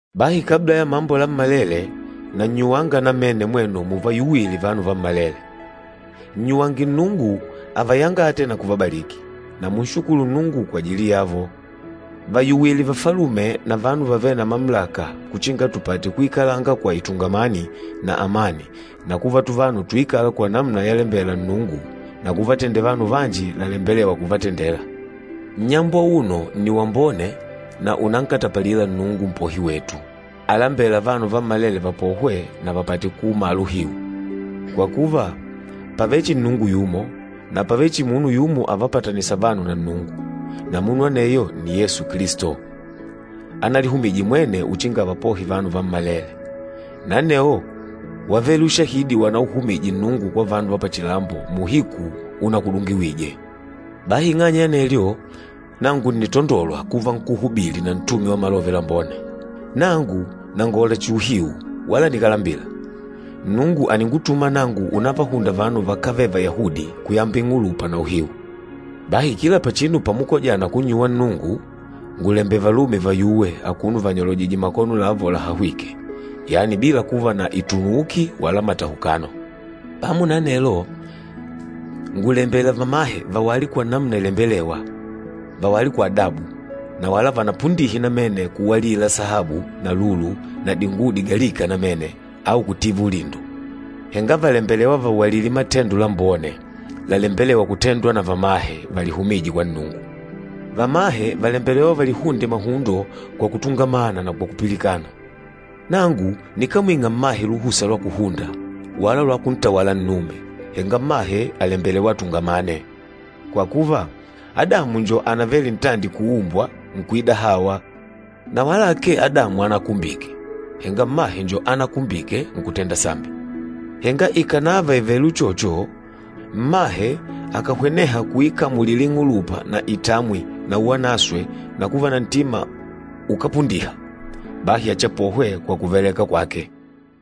Bahi kabla ya mambo lammalele, nannyuwanga namene mwenu muvayuwile vanu vammalele. Nnyuwange Nnungu avayangate na kuvabaliki, na munshukulu Nnungu kwajili yavo. Vayuwile vafalume na vanu vavêle na mamulaka uchinga tupate kuikalanga kwa itungamani na amani na kuva tuvanu tuikâla kwa namuna yalembela Nnungu na kuvatendela vanu vanji lalembelêwa kuvatendela. Nnyambo auno nni wambone na ùnankatapalila Nnungu Mpohi wetu, alambêla vanu vammalele vapohwe na vapate kuumala uhiu. Kwa kuva, pàvele chihi Nnungu yumo, na pàvele chihi munu yumo avapatanîsa vanu na Nnungu, na munu aneyo nni Yesu Kilisto, analihumije mwene uchinga avapohe vanu vammalele. Na anewo wávele ushahidi wanauhumije Nnungu kwa vanu va pachilambo muuhiku unakudungiwije. Bahi ing'anya ya anelyo, nangu ǹnitandolwa kuva nkúhubili na ntume wa Malove Lambone. Nangu nàngola chihi uhiu wala nikálambila. Nnungu àningutuma nangu unavahunda vanu vakávele Vayahudi kuyamba ing'ulupa na uhiu. Bahi kila pachinu pamukojana kunnyuwa Nnungu, ngùlembela valume vayuwe akuno vanyolojìjè makono lavo lahahwîke, yani bila kuva na itunuuki wala matahukano. Pamo na anelo, ngùlembela vamahe vawale kwa namuna ilembelêwa. Vawale kwa adabu, na wala vanapundihe namene kuwalila sahabu na lulu na dinguwo digalika namene au kutiva ulindo. Henga vàlembelewa vawalile matendo lambone lalembelêwa kutendwa na vamahe valihumîje kwa Nnungu. Vamahe vàlembelewa valihunde mahundo kwa kutungamana na kwa kupilikana. Nangu nikámwing'a mmahe luhusa lwa kuhunda, wala lwa kuntawala nnume, henga mmahe àlembelewa atungamane. Kwa kuva, Adamu njo anavele ntandi kuumbwa, nkuida Hawa. Na wala akee Adamu ánakumbike, henga mmahe njo ánakumbike, nkutenda sambi. Henga ikànava ìvele uchocho, mmahe akàhweneha kuikamulila ing'ulupa na itamwi na uwanaswe na kuva na ntima ukápundiha, bahi achiapohwe kwa kuvaleka kwake.